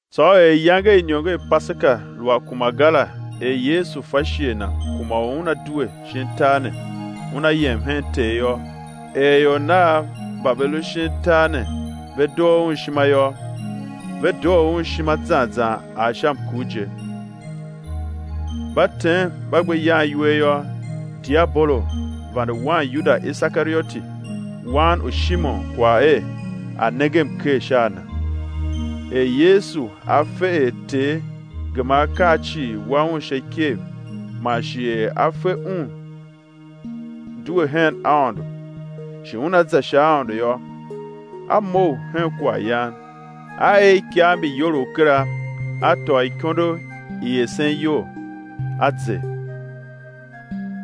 Tsô er iyange i iniongo i Paseka lu a kuma ga la er Yesu fa shighe Na kuma u Una due shin tar ne, Una yem hen Ter yô, er ior Nav mba ve lu shin tar ne ve doo Un ishima zan zan ar sha mkur je. Mba tem mba gbe yan iwer yô, diabolo vande wan Yuda Isekarioti, wan u Shimon kwagh er a̱ nenge mker sha a Na er Yesu A fe er Ter gema akaa cii wa Un sha ikev man shi er A fe er Un due hen Aôndo, shi Una za sha Aôndo yô,— A mough hen kwaghyan, A er ikav mbi iyolough kera, a tôô ikondo i esen iyol, A zer;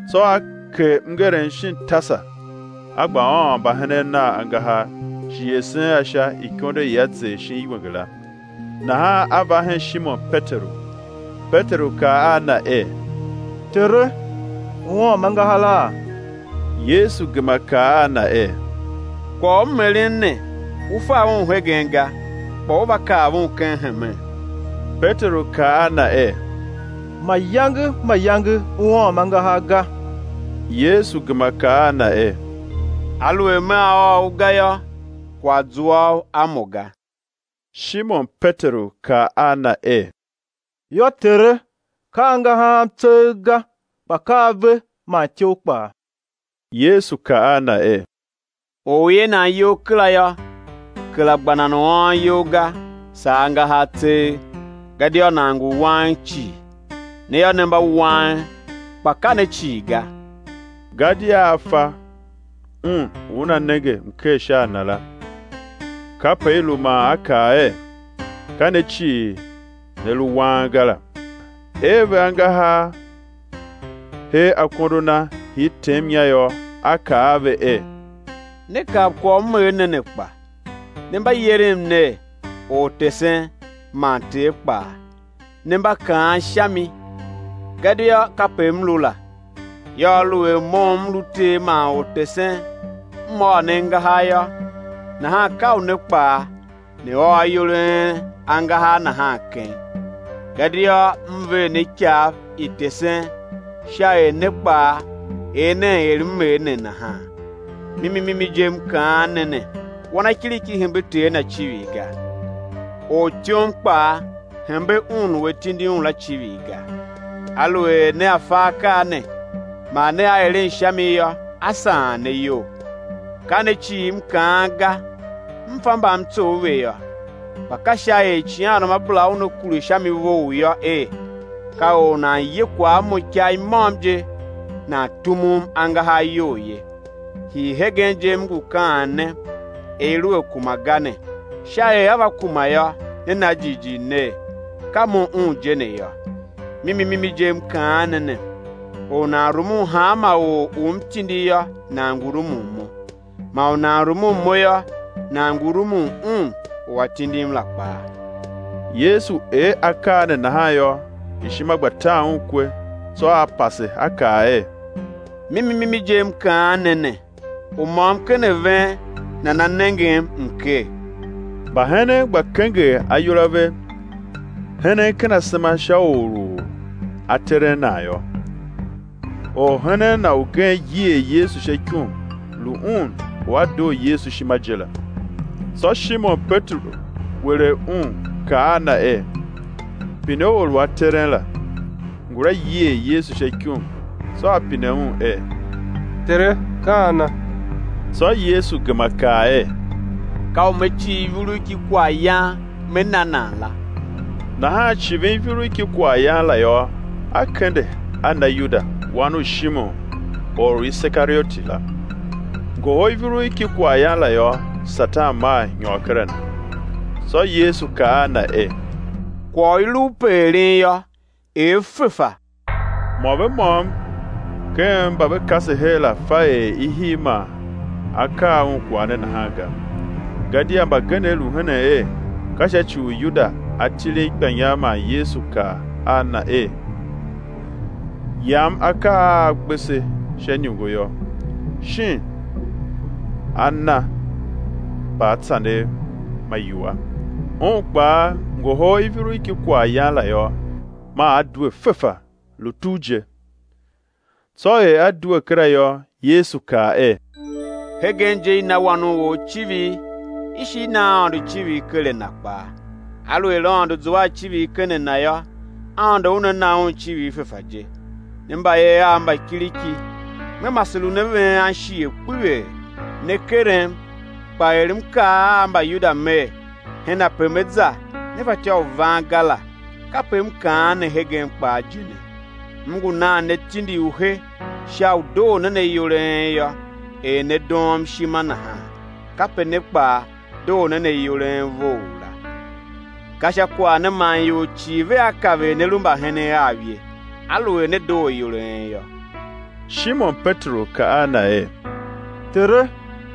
tsô A ker mngerem shin tasa, A gba ôôn mbahenen Nav angahar, shi esen a sha ikondo i A zer shin iwenge la. Nahan A va hen Shimon Peteru; Peteru kaa a Na er: Tere, Ú ôôm angaharaa? Yesu gema kaa a na er: Kwagh u M eren ne, u fa un hegen ga, kpa ú va kav un ken hemen. Peteru kaa a Na er: Mayange mayange Ú ôôm angahar ga. Yesu gema kaa a na er: Aluer Mea ôô u ga yô, kwagh zua u a Mo ga. Shimon Peteru kaa a Na er: Yô Tere, ka angahar am tseegh ga, kpa ka ave man ityough kpaa. Yesu kaa a na er: Or u i ee nan iyol kera yô, kera gba u nan a ôô iyol ga, saa angahar tseegh; gadia nan ngu wang cii. Ne yô, ne mba wang, kpa ka ne cii ga. Gadia A fa un u una nenge mker sha a Na la, kape i lu man A kaa er: Ka ne cii ne lu wang ga la. Ee ve angahar hee akondo Na, hir tem inya yô, A kaa a ve er: Ne kav kwagh u M er ne ne kpa? Ne mba yerem ner: Ortesen man Ter kpaa; ne mba kaan sha mi, gadia kape M lu la. Yô, aluer Mo u M lu Ter man Ortesen, M ôô ne angahar yô, nahan ka u ne kpaa ne ôô ayol a en angahar nahan keng. Gadia M ver ne ikav i tesen sha er ne kpaa er nen er M er ne nahan. Mimi mimi je, M kaan ne ne, wanakiriki hembe ter na icivir ga, ortyom kpaa hembe un u a tindi un la icivir ga. Aluer nea fa akaa ne, man nea eren sha mi yô, á saan ne iyol. Ka ne cii M kaan ga; M fa mba M tsough ve yô; kpa ka sha er icighanruamabera Una kure sha mi vough yô er: Ka or u nan ye kwagh a Mo ikagh i môm je nan tumum angahar iyol ye. Hii hegen je, M ngu kaan ne, er i lu a kuma ga ne, sha er á va kuma yô, né na jighjigh ner, ka Mo Un je ne yô. Mimi mimi je M kaan ne ne, or u nan rumun hanma or u M tindi yô, nan ngu rumun Mo; man u nan rumun Mo yô, nan ngu rumun Un u A tindim la kpaa. Yesu er akaa ne nahan yô, ishima gba tan Un kwe, tsô A pase A kaa er: Mimi mimi je M kaan ne ne, u môm ken a ven nana nengem mker. Mbahenen gba kenger ayol a ve, henen ken asema sha or u A teren nan yô. Orhenen Na ugen yier Yesu sha ikum, lu un u a doo Yesu ishima je la, tsô Shimon Peteru welegh un, kaa a na er: Pine or u A teren la. Ngula yier Yesu sha ikum, tsô a pine Un er: Tere, ka ana? Tsô Yesu gema kaa er: Ka u Me civ ivurugh ki kwaghyan Me na nan la. Nahan civin ivurugh ki kwaghyan la yô, A kende, a na Yuda, wan u Shimon or u Isekarioti la. Ngohol ivurugh ki kwaghyan la yô, Satan maa nyôr ker a na. Tsô Yesu kaa a na er: Kwagh u i lu u pe eren yô, er fefa. Mô ve môm ken mba ve kase her la fa er i hii man A kaa un kwagh ne nahan ga. Gadia mbagenev lu henen er, ka sha ci u Yuda a tilin ikpanyar man Yesu kaa a na er: Yam akaa a a gbe se sha iniongo yô, shin a̱ na mbaatsanev ma iwua. Un kpaa, ngohol ivurugh ki kwaghyan la yô, maa a due fefa, lu tugh je. Tsô er a due kera yô, Yesu kaa er: Hegen je i na Wan u or icivir, i shi i na Aôndo icivir ker a Na kpaa. Aluer Aôndo zua a icivir ken a Na yô, Aôndo Una na Un icivir fefa je. Ne mbayev Av mba kiriki, Me mase lun a ven anshighe kpeghee, né kerem, kpa er M kaa a Mbayuda Mer, hen ape Me za, ne fatyô u van ga la, kape m kaan ne hegen kpaa je ne. M ngu nan ne tindi u he sha u doo nen ayol a en yô; er ne doom ishima nahan, kape ne kpaa, doo nen ayol a en vough la. Ka sha kwagh ne man ior cii vea kav er ne lu mbahenen Av ye, aluer ne doo ayol a en yô. Shimon Peteru kaa a Na er: Tere,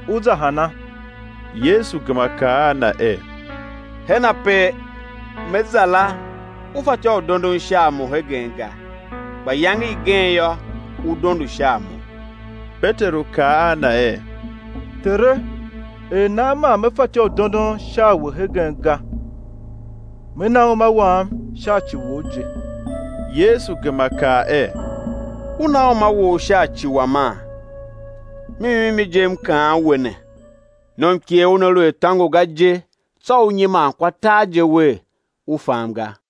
Ú za hana? Yesu gema kaa a Na er: Hen ape Me za la, u fatyô u dondon sha a Mo hegen ga; kpa iyange igen yô, ú dondo sha a Mo. Peteru kaa a Na er: Tere, er nan man Me fatyô u dondon sha a We hegen ga? Me na uma wam sha ci Wou je. Yesu gema kaa er: Ú na uma wou sha ci Wama? Mimi mimi je M kaan we ne, nomikegh una lu a tôngo ga je tsô ú nyiman kwa tar je wer, u fam ga.